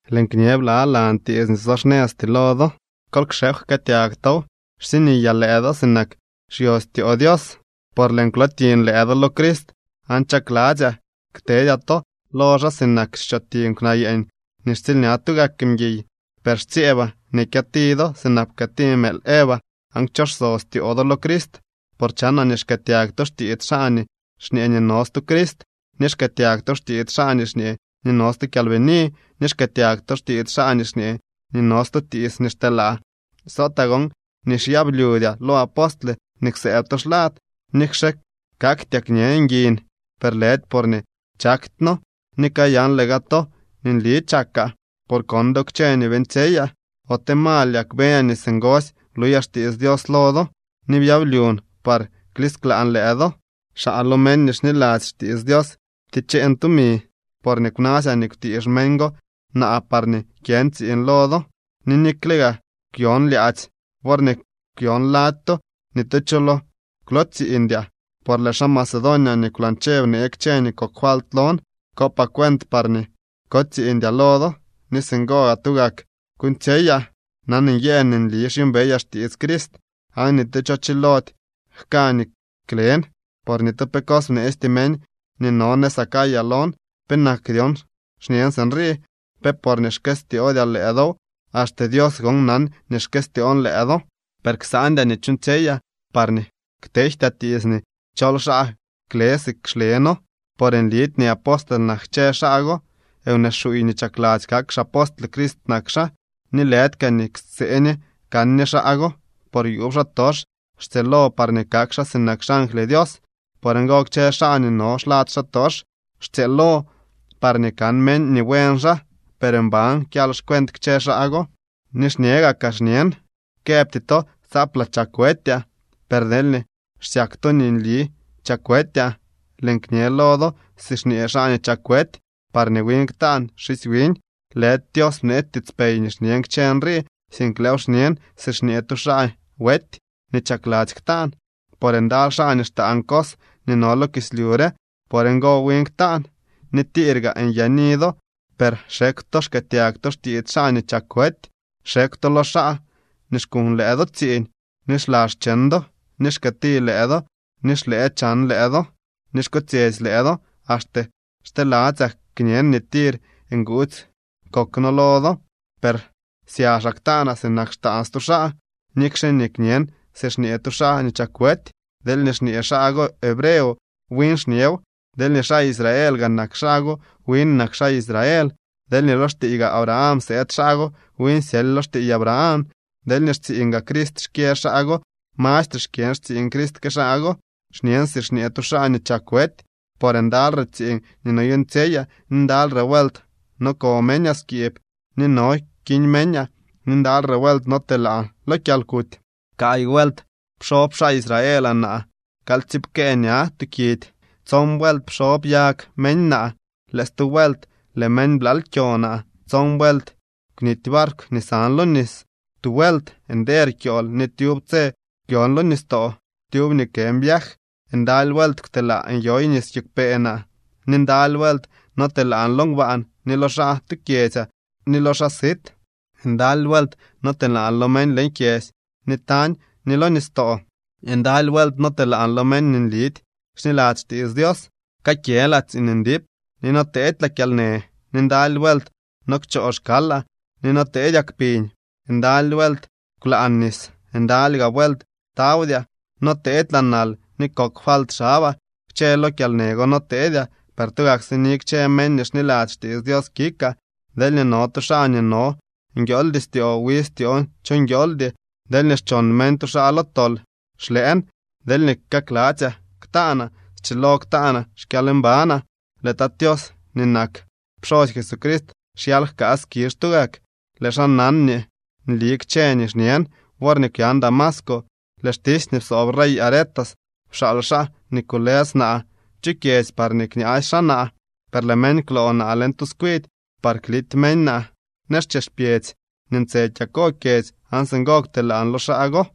Lëën kñe blalan tiits nii so xnëzty lo do. Kol kxekw jkëëtyag tow. Xsiniyaa lëë do sinak xyostyoo Dios, por lëën kwlootiñ lëë do lo Crist aan chakladzyaa ktedyaa to lo xaa sinak xchotiñ kwnaa yeeñ nii xtsiilña tugak mguiy. Per xtsyeebaa nii kyëti do sinak pkëëti mëël Eva aan kchoso styoo do lo Crist. Por chanaa nii xkëëtyag to xtiits xaa nii xñee nii no stu Crist, ni xkëëtyag to xtiits xaa nii xñee nii no stu kyalbini, ni xkëëtyag to xtiits xaa nii xñee nii no stu tiits nii xteelaa. Sotaa gon nii xyablyudyaa lo apostle nii kwsëëb to xlad. Nikxe kaktyaa kñe nguin, per lëdy porñee chaktyno. Ni kayanle gaa to nii nli chakaa, por kon do kchë nii beeñtsyeyaa. ¿Ote mal yak beñaa nii singosy bluyaa xtiits Dios lo do, ni byablyun par klisklaan lëë do? Xaa lo meñ nii xniladzy xtiits Dios pticheen tumi, porñee kwnasyaa nii kwtiix meñ go naa parñee kyën tsiiñ lo do. Ni nikle gaa kwyon lyaadzy worñee kwyon lady to, ni tu cho lo kwlootsiiñdyaa, por lëë xaa Macedonia nii kwlañche bnee kchë nii kok falt lon. Kopaa cuent parñee kotsiiñdyaa lo do ni singo gaa tugak kuuñtsyeyaa. Nan nyëën nii nli xyuumbeyaa xtiits Crist, aan ni tu cho chilody jka nii klen, por ni tu pe bneesty meñ nii no nëz Acaya lon. ¿Penak dyon xñen sinrii, pe porñee xkëstyoodyaa lëë dow? Axte Dios gon nan nii xkëstyoon lëë do. Per ksandyaa nii chuuñtsyeyaa, parñee ktejtyaa tiits nii chol xaa kle si xle noo. Por nlidy nii apostle nak kchë xaa go. Wnee xuuy nii chakladzy kak xapostle Crist nak xaa. Ni lëdy kaa nii ksee ñe kan ñe xaa go, por yuub xaatox xtsyëëlo parñee kak xaa sinak xangly Dios. Por ngo kchë xaa nii no xlad xaatox xtsyëëlo parñee kan meñ nii buen xaa, per mban kyal xcuent kchë xaa go. Ni xñe gakaa xñen: Këbty to tsaaplaa chak wetyaa, per deelñee xsyak to nii nli chak wetyaa, lëën kñe lo do si xñee xaa nii chak wety parñee win ktaan xisy wiñ. Lëdy Dios bneetsy tiitspey nii xñen kchë nrii, sink lëëw xñen si xñee tu xaa wety nii chakladzy ktaan. Por ndaly xaa nii xtaan cos nii no lo kislyu re no. Por ngo, win ktaan. Ni tir gaa nyaani do, per xekw to xkëëtyag to xtiits xaa nii chak wety. Xekw to lo xaa nii xkuñ lëë do tsiiñ, ni xla xcheñ do, ni xkëëti lëë do, ni xlëë chan lëë do, ni xkotsyetsy lëë do. Axte xteladzyaa kñen nii tir nguudzy kok noo lo do. Per syaxaa ktaanaa sinak xtaan stu xaa, nikxe nii kñen si xñee tu xaa nii chak wety. Deelñee xñee xaa go hebreo, win xñew. Deelñee xaa Israeel gaa nak xaa go, win nak xaa Israel. Deelñee lo xtiiy gaa Abraham sëëd xaa go, win syely lo xtiiy Abraham. Deelñee xtsiiñ gaa Crist xkyë xaa go, mastre xkyën xtsiiñ Crist que xaa go. Xñen si xñee tu xaa nii chak wety. Por ndalyre tsiiñ nii noyuuñtsyeyaa, ni ndalyre vuelt no ko meñaa skiib, ni no kiñ meñaa, ni ndalyre vuelt notelaan lo kyalkuty. Kaay vuelt pxob xaa Israel naa kalyptsiipkee ña tuu kidy. Tson vuelt pxob yag meñ naa. Lëë stu vuelt lëë meñ blaal kyo naa. Tson vuelt kwnity barkw nii san lo nis. Tu vuelt nder kyool ni tyub tse kwyon lo nistoo. Tyub nii kën viaj, ndaly vuelt kwtelaa nyoy nis kiigwpee naa. Ni ndaly vuelt notelaan lo ngbaan ni lo xaa tu kyedzyaa ni lo xaa sit. Ndaly vuelt notelaan lo meñ leñ kyedzy ni tañ ni lo nistoo. Ndaly vuelt notelaan lo meñ nii nlidy xniladzy xtiits Dios. Kakyëlaa tsiiñ ndip ni noteedylaa kyalnë. Ni ndaly vuelt no kchoo xkalaa, ni no teedyaa kpiñ. Ndaly vuelt kwlaan nis. Ndaly gaa vuelt tawdyaa. Noteedylaa nal ni kok falt xabaa. Kchë lo kyalnë go noteedyaa, per tugak sini kchë meñ nii xniladzy xtiits Dios kikaa. Deelñee no tu xaa nii no nguiooldy styoo, wi styoon cho nguiooldy. Deelñee xchon meñ tu xaa lo tol, xlëën. Deelñee kakladzyaa ktaanaa, schilo ktaanaa xkyalmbanaa. Lëë Tat Tios nii nak pxosy Jesucrist xyal jkaa skizh tugak. Lëë xaa nan nii nli kchë nii xñen. Worñee kwyan Damasco, lëë xtisy nii psoob rey Aretas pxaal xaa nii kulës naa chu kyedzy parñee kñaasy xaa naa. Per lëë meñ kwloo naa leñ tu tskwidy par klity meñ naa nëz chex pyedzy nii ntse kyako kyedzy, aan singo kwtelaan lo xaa go.